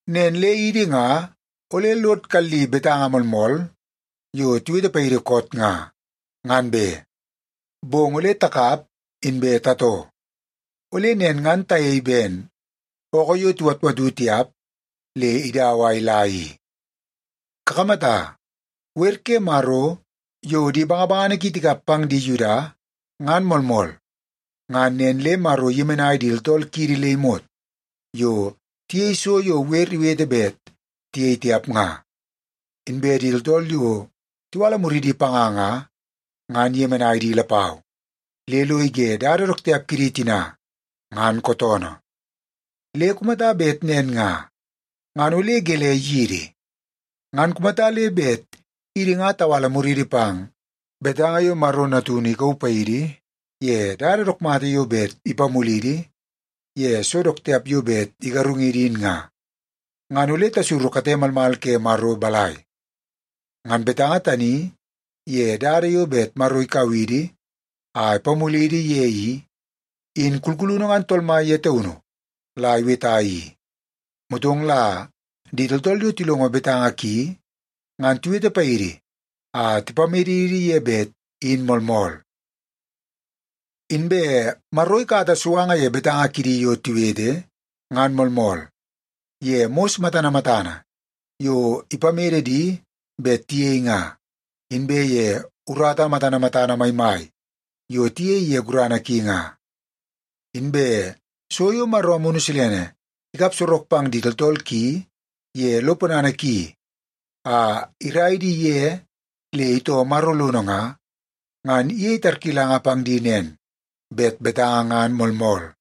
Nen le idi nga ole lod kalli betanga moolmool yo tiwete paidi koot nga, ngan be, bong ole takap inbe tatoo. Ole nen ngan tayei ben ookoo yo tiwatwatu tiap le idau a ila i. Kakamata, wer ke Maro yo di bangabangana ki tikap pang di Yuda ngan moolmool, ngan nen le Maro iyemenai di tooltool kidi le imot yo tiyei so yo wer iwete bet tiyei tiap nga. Inbe di tooltool yo tiwala muridi panga nga, ngan iyemenai di lapau, le lo ige dada dook tiap kidi tina ngan kootoonoo. Le kumata bet nen nga, ngan ole gelei yidi? Ngan kumata le bet idi nga tawala muriidi pang betanga yo Maro Natunu ikauu paidi ye dada dook mata yo bet ipamulidi ye so dook tiap yo bet igarungidi in nga, ngan ole tasuru kate malmal ke Maro balai? Ngan betanga tani ye dada yo bet Maro ikau idi a ipamulidi ye i, in kulkulunu ngan Tool Mai ye taunu la iweta i, motong la di tooltool yo tilongo betanga ki, ngan tiwete paidi a tipamedidi ye bet in moolmool. Inbe Maro ikata suanga ye betanga kidi yo tiwete, ngan moolmool, ye mos matana matana yo ipamede di bet tiyei nga, inbe ye urata matana matana maimai yo tiyei ye gurana ki nga. Inbe so yo Maro Amunu Silene ikap sorok pang di tooltool ki ye lo ponana ki a irai di ye le itoo Maro lono nga, ngan iyei tarkilanga pang di nen, bet betanga ngan moolmool.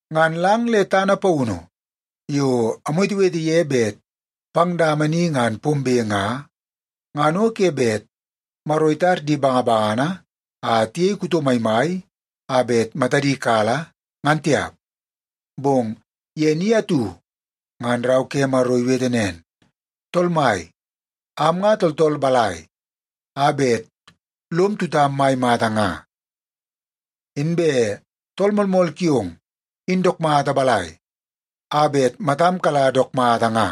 Ngan lang le tana paunu yo amwetewete ye bet pang dama ni ngan pombe nga, ngan o ke bet Maro itar di bangabangana a tiyei kuto maimai a bet matadi kala, ngan tiap. Bong ye ni atu ngan Rau ke Maro iwete nen, “Tool Mai, am nga tooltool balai a bet lom tutam mai mata nga? Inbe tool moolmool kiong in dook mata balai a bet matam kala dook mata nga?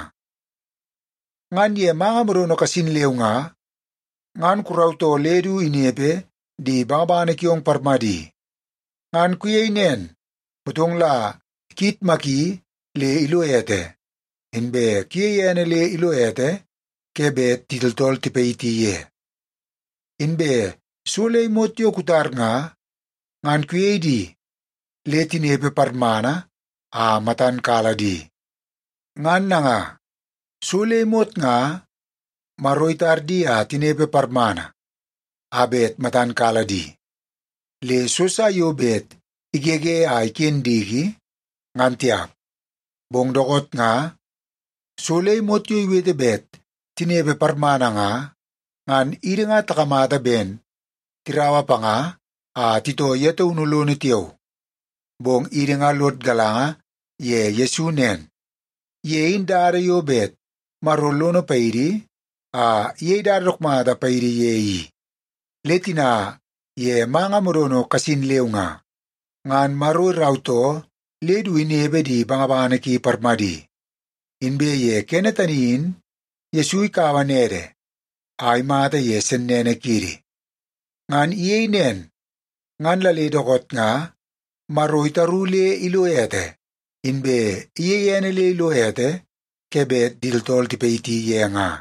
Ngan ye manga modono kasin leu nga, ngan kurautoo le du inepe di bangabangana kiong parmadi. Ngan kuyeii nen, motong la kuyitmaki le ilo ete, inbe kuyei ene le ilo ete ke bet di tooltool tipayiti ye. Inbe so le imot yo kutar nga, ngan kuyei di le tinepe parmana a matan kala di.” Ngan nanga, so le imot nga Maro itar di a tinepe parmana a bet matan kala di, le so sa yo bet igege a iken diki, ngan tiap. Bong dookoot nga so le imot yo iwete bet tinepe parmana nga, ngan idi nga takamata ben tiraua panga a titoo ye taunu lono tiao. Bong idi nga lod galanga ye Yesu nen, ye in dada yo bet Maro lono paidi a iyei dada dook mata paidi ye i. Le tina ye manga modono kasin leu nga, ngan Maro irautoo le du inepe di bangabangana ki parmadi. Inbe ye kene tani in Yesu ikaua nede a imata ye sennene kiidi. Ngan iyei nen, ngan la le dookoot nga Maro itaru le ilo ete, inbe iyeie ene le ilo ete ke bet di tooltool tipayiti ye nga.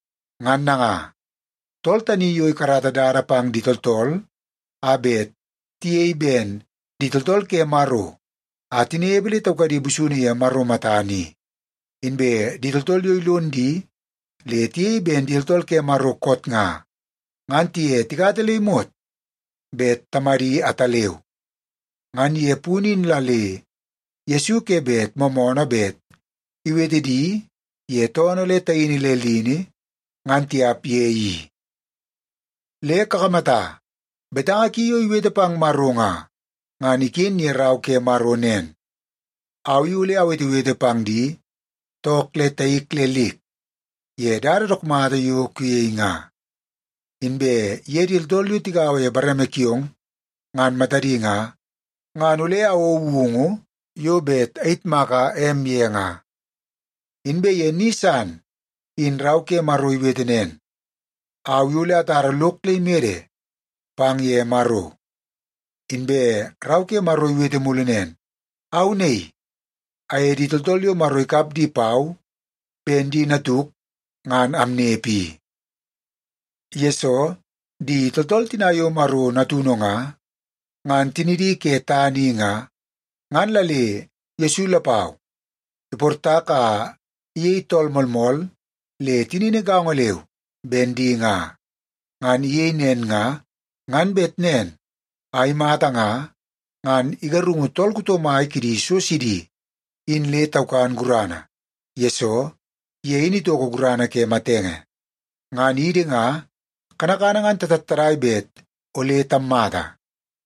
Ngan nanga, tool tani yo ikarata dada pang di tooltool a bet tiyei ben di tooltool ke Maro a tinepe le taukadi busunu ye Maro matana i, inbe di tooltool yo ilon di le tiyei ben di tooltool ke Maro koot nga, ngan tiye tikata le imot bet Tamadi ataleu. Ngan ye punu in la le Yesu ke bet moomoonoo bet iwete di ye toonoo le taini le lini, ngan tiap ye i. Le kakamata, betanga ki yo iwete pang Maro nga, ngan iken ye Rau ke Maro nen, “Au i ole awetewete pang di took le taik le lik ye dada dook mata yo kuyei nga. Inbe ye di tooltool yo tigaua ye bareme kiong, ngan matadi nga, ngan ole awou woungu yo bet ayitmaka em ye nga.” Inbe ye ni san in Rau ke Maro iwete nen, “Au i ole atara lok le imede pang ye Maro.” Inbe Rau ke Maro iwete mulu nen, “Au naii, aye di tooltool yo Maro ikap di pau ben di natuk ngan amnepe i.” Yesoo di tooltool tina yo Maro natunu nga, ngan tinidi ke tana i nga, ngan la le Yesu lapau iportak a iyei tool moolmool le tinini gaongo leu ben di nga. Ngan iyei nen nga, ngan bet nen a imata nga, ngan igarungu tool kuto mai kidi so sidi in le taukan gurana, yesoo ye in itoko gurana ke matenge. Ngan idi nga, kanakana ngan tatattadai bet ole tammata.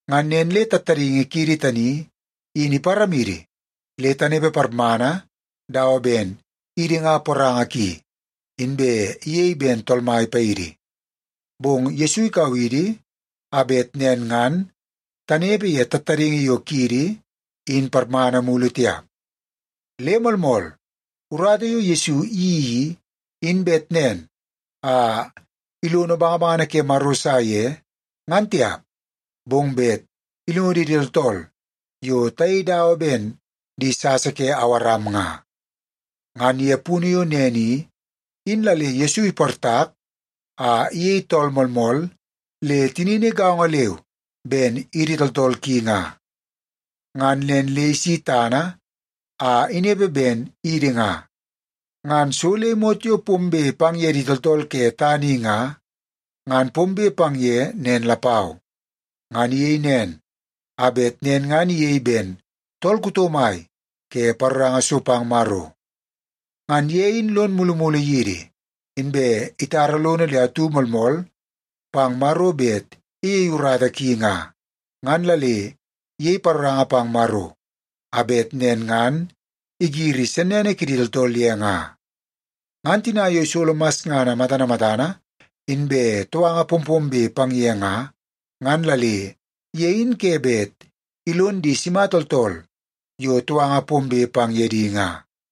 Ngan nen le tattadaingi kiidi tani in iparamidi le tanepe parmana dawa ben idi ngan poranga ki, inbe iyei ben tool mai paidi. Bong Yesu ikau idi a bet nen ngan tanepe ye tattadaingi yo kiidi in parmana mulu tiap. Le moolmool, urata yo Yesu iyeii i, in bet nen a ilono bangabangana ke Maro sa ye, ngan tiap, bong bet ilonidi idi tooltool yo tayei dawa ben di sasa ke Awaram nga. Ngan ye punu yo nen i, in la le Yesu iportak a iyei tool moolmool le tinini gaongo leu ben idi tooltool ki nga. Ngan nen le isi tana a inepe ben idi nga, ngan so le imot yo pombe pang ye di tooltool ke tana i nga, ngan pombe pang ye nen lapau. Ngan iyei nen, a bet nen ngan iyei ben tool kuto mai ke paroranga so pang Maro. Ngan ye in lon mulumulu yidi, inbe itara lono le atu moolmool pang Maro bet iyei urata ki nga, ngan la le iyei paroranga pang Maro a bet nen ngan igiri sennene kiidi tooltool ye nga. Ngan tina yo isolo masngana matana matana, inbe touanga pompombe pang ye nga, ngan la le ye in ke bet ilon di sima tooltool yo touanga pombe pang ye di nga.